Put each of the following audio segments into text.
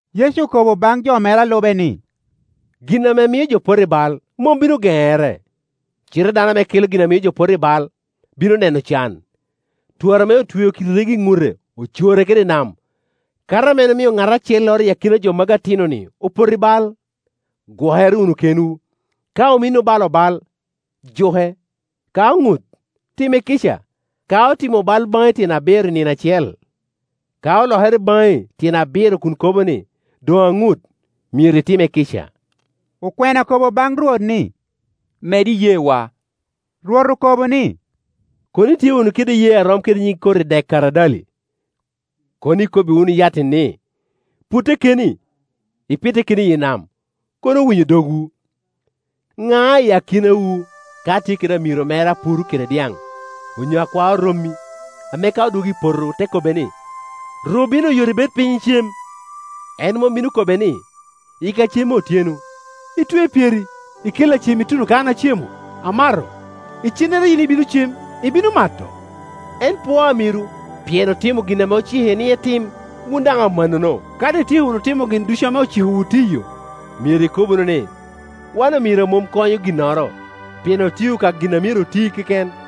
Yecu okobo baŋ jo mere a lube ni, “Gin ame mio jo poto i bal mom bino geŋere; cite dano ame kela gin a mio jo poto i bai bino neno can! Twara ame otweo kidi rego i ŋute, ocore kede i nam, kato ame en omio ŋat acelloro i akina jo magi atinoni opoto i bal. Gwokere wunu kenwu! Ka ominni obalo bal, juke; ka oŋut, time kica. Ka otimo bal baŋi tyen abiro i nino acel, ka olokere baŋi tyen abiro kun kobo ni, ‘Doŋ aŋut,’ myero itime kica.” Okwena okobo baŋ Rwot ni, “Med iyeewa!” Rwot okobo ni, “Kono itye wunu kede iyee a rom kede nyig koti dek karadali, kono ikobbi wunu yat-ti ni, ‘Putte keni, ipitte keni iyi nam,’ kono owinyo dogwu. “Ŋa i akinawu ka tye kede amiro mere a puro kede dyaŋ, onyo a kwao rommi, ame ka odwogo i poto te kobbe ni, ‘ru bino oyot, ibed piny, icem?’ En mom bino kobbe ni, ‘Yikka cem me otyeno, itwe pyeri, ikella cem ituno ka an acemo, amato, icennere yin ibino cem, ibino mato?’ En pwoo amiro pien otimo gin ame ocike ni etim? Wun daŋ amannono, ka doŋ ityeko wunu timo gin ducu ame ocikowu tiyo, myero ikob wunu ni, ‘Wan omiro a mom konyo ginnoro, pien otio ka gin a myero oti keken.’”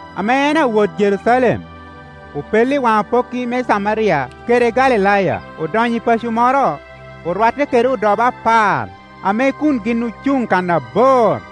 Ame en awot Jerucalem, opello i waŋ apokki me Camaria kede Galilaya. Odonyo i paco moro, orwatte kede odobo apar, ame kun gin ocuŋ kan abor.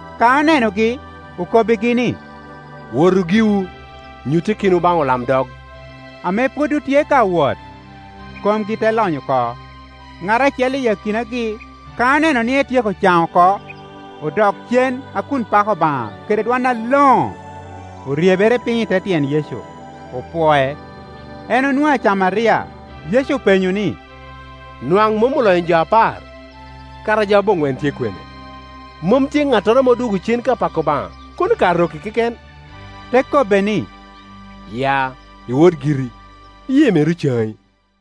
Ka onenogi, okobbigi ni, “Wotu giwu, nyutte kenwu baŋ olamdog.” Ame pwod otye ka wot, komgi te lony oko. Ŋat acel i akinagi, ka oneno ni etyeko caŋ oko, odok cen a kun pako Obaŋa kede dwon aloŋo. Oryebere piny i te tyen Yecu, opwoe. En onwoŋo Acamaria. Yecu openyo ni, “Nwaŋ mom olonyo jo apar? Kara jo aboŋwen tye kwene? Mom tye ŋattoro ame odwogo cen ka pako Obaŋa, kono ka arok-ki keken?” Te kobbe ni, “Ya, iwot giri, iyee meri ocaŋi.”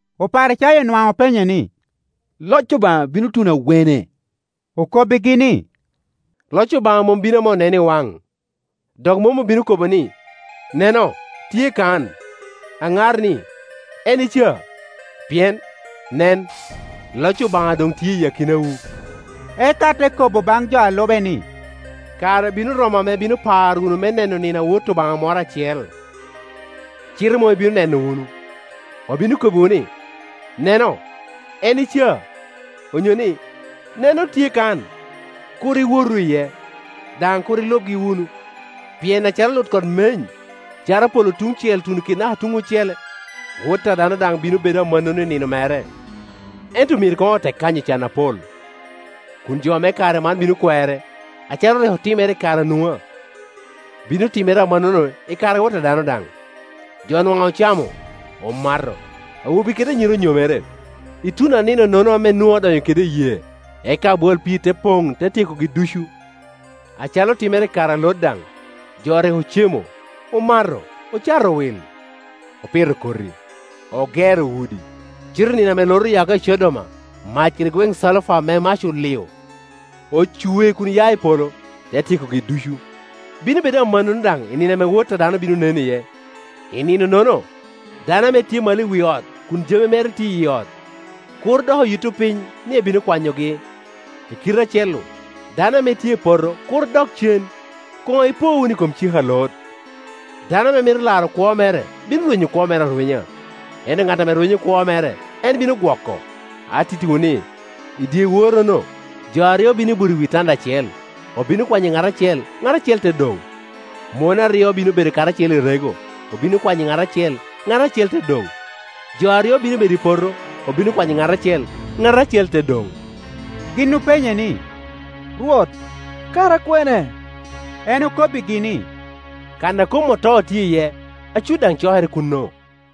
Oparicayo nwaŋ openye ni, “Loc Obaŋa bino tuno awene?” Okobbigi ni, “Loc Obaŋa mom bino ame oneno i waŋ. Dok mom obino kobo ni, ‘Neno, tye kan!’ aŋar ni, ‘En i ca!’ Pien, nen, loc Obaŋa doŋ tye i akinawu.” Eka te kobo baŋ jo a lube ni, “Kare bino romo ame ibino paro wunu me neno nino a Wot Obaŋa moro acel, cite mom ibino neno wunu. Obino kobbiwu ni, ‘Neno, en i ca!’ onyo ni, ‘Neno, tye kan!’ Kur iwotu iye, daŋ kur ilubgi wunu. Pien acalo lutkot meny, caro polo tuŋ cel tuno kede naka tuŋ ocele, Wot a dano daŋ bino bedo amannono nino mere. Ento myero koŋ otek kanyo can apol, kun jo me kare man bino kwere. Acalo rik otimere i kare a Nua, bino timere amannono i kare a Wot a dano daŋ. Jo nwaŋ ocamo, omato, awobe kede anyira onyomere, ituno a nino-nono ame Nua odonyo kede i yee, eka abwal pii te poŋ, te tyekogi ducu. Acalo otimere i kare a Lot daŋ. Jo rik ocemo, omato, ocato wil, opito koti, ogero udi, cite i nino ame Lot oya oko i Codom, mac kede gweŋ calufa ame mac olio ocwe kun ya i polo, te tyekogi ducu. Bino bedo amannono daŋ i nino ame Wot a dano bino nen iye. I nino-nono dano ame tye malo i wi ot kun jami mere tye iyi ot, kur dok oyitto piny ni ebino kwanyogi. I kite acel-lu, dano ame tye i poto kur dok cen. Koŋ ipo wunu i kom cik a Lot. Dano ame mito laro kwo mere bino rwenyo kwo mere arwenya; ento ŋat ame rwenyo kwo mere, en bino gwoko. Atittiwu ni, i dyeworrono jo aryo bino buto i wi tanda acel; obino kwanyo ŋat acel, ŋat acel te doŋ. Mon aryo bino bedo karacel i rego; obino kwanyo ŋat acel, ŋat acel te doŋ. [ Jo aryo bino bedo i poto; obino kwanyo ŋat acel, ŋat acel te doŋ.]” Gin openye ni, “Rwot, kara kwene?” En okobbigi ni, “Kan a kom oto tye iye, acut daŋ cokere kuno.”